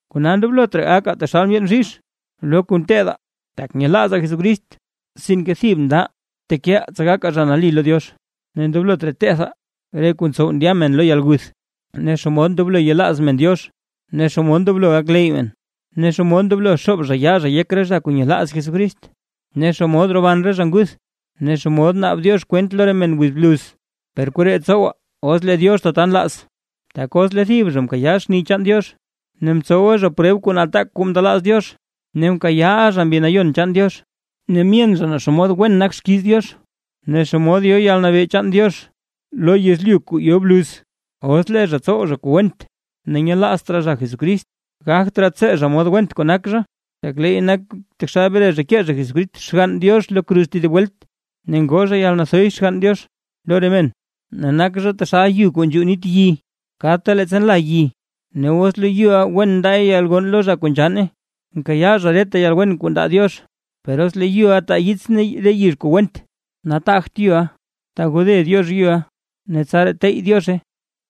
Kona ndoblot raa gakaa taxal ndyeen bzhizh lo kuu nteedaa tak nyelaazaa Jesucrist, sinke thib ndaʼaa tekeʼaa tsa gakaa zha nali lo Diox. Ne ndoblot raa tethaa: re kuu ntsow ndya men lo yalguth, ne xomod ndoblo yelaaz men Diox, ne xomod ndoblo gakleyy men, ne xomod ndoblo xoob zha yaa zha yek re zha kuu nyelaaz Jesucrist, ne xomod roban re zha nguth, ne xomod naab Diox kwent lo re men wiz bluz. Per koree tsowaa, os lee Diox tata nlaaz. Tak os lee thib zha mkayaa xni chaan Diox, ne mtsowa zha preb kuu nataak kuu mndelaaz Diox, ne mkayaaʼa zha Mbi Nayon chaan Diox, ne myen zha naa xomod wen nak xkiiz Diox, ne xomod yo yalnabee chaan Diox lo yezlyu kuu yo bluz, os lee zha tsow zha kuu went ne nyelaazt raa zha Jesucrist, gagt raa tsee zha mod went kuu nak zha, tak leey nak taxal bre zha kee zha Jesucrist Xgann Diox lo kruz tedib welt, ne ngoo zha yalnathoy Xgann Diox lo re men. Ne nak zha taxal yu kuu nzhuu nit yi kadta leettsa nla yi; ne os lee yuʼa wen ndaay yalgonn lo zha kuu nzhanne, nkayaa zha reta yalwen kuu ndaa Diox; per os lee loyuʼa taa yits ne re yizh kuu went, nataagt yuʼa, tagode Diox yuʼa ne tsaraa tey Diozhe.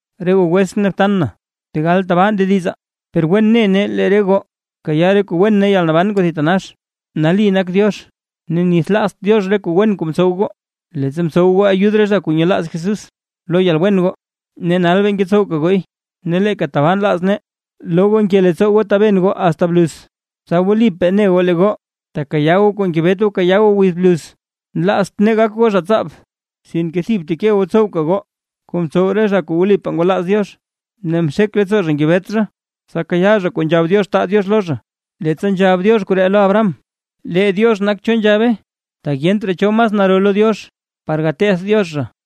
Re goo wetsʼn ne btan na, tegal tabaa ndedizaa, per wen ne nee lee re goo kayaa re kuu wen ne yalnaban kuu thitanax. Nali nak Diox ne nithlaazt Diox re kuu wen kuu mtsow goo, leettsa mtsow goo ayud re zha kuu nyelaaz Jesús lo yalwen goo, ne nal bee ngetsowka gooy. Ne leeka tabaa nlaz nee loo goo nke leettsoo goo taben goo asta bluz, tsa wlipaa ne goo lee goo tekayaa goo kuu ngebet goo kayaa goo wiz bluz. Nlaazt nee gak goo zha tsaab, sinke thib bteke goo btsowka goo kuu mtsow re zha kuu wlipaa ngwalaaz Diox, ne mxek leettsoo zha ngebet zha, tsa kayaa zha kuu nzhab Diox taa Diox lo zha. Leettsa nzhab Diox koree lo Abraham, lee Diox nak cho nzhabe, tak yent raa cho mas naro lo Diox par gateth Diox zha;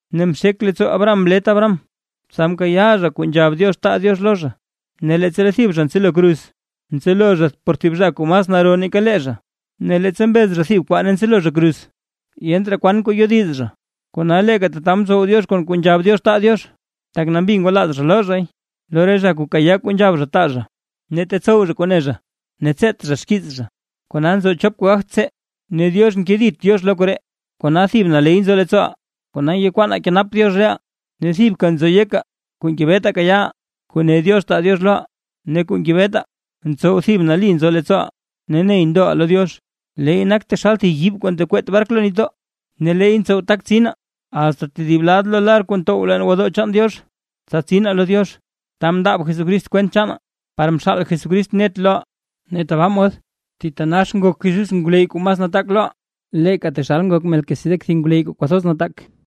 Ne mxek leettsoo Abraham mlet Abraham, tsa mkayaa zha kuu nzhab Diox taa Diox lo zha. Ne leettsa lee thib zha ntselo kruz; ntselo zha por thib zha kuu mas naro nake lee zha; ne leettsa mbez zha thib kwaa ne ntselo zha kruz, yent raa kwan kuu yodiz zha. Kona leeka tata mtsow Diox kon kuu nzhab Diox taa Diox, tak nambi ngwalaaz zha loo zhay lo re zha kuu kayaa kuu nzhab zha taa zha, ne tetsow zha kuu ne zha ne tseet zha xkiiz zha. Kona nzo chop kuu gagt tsee, ne Diox nkedit Diox lo koree; kona thib naley nzo leettsooʼaa ngekwaanaa kenap Diox reʼaa, ne thibka nzo yekaa kuu ngebetaa kayaaʼaa, kuu ne Diox taa Diox loʼaa. Ne kuu ngebetaa ntsow thib nali nzo leettsooʼaa ne ney ndoʼaa lo Diox, leey nak taxal thib yiib kuu ntekweet bark lo nitdoo. Ne leey ntsow tak tsinaa, asta tedib lad lo lar kuu ntow leen gwodoo chaan Diox, tsa tsinaa lo Diox, ta mndaab Jesús kwent chaanaa, par mxaal Jesús net loʼaa, ne tabaa mod thitanax nak Jesús ngwleyy kuu mas nataak loʼaa, leeka taxal, ngok Melquisedec thib ngwleyy kuu kwathoz nataak.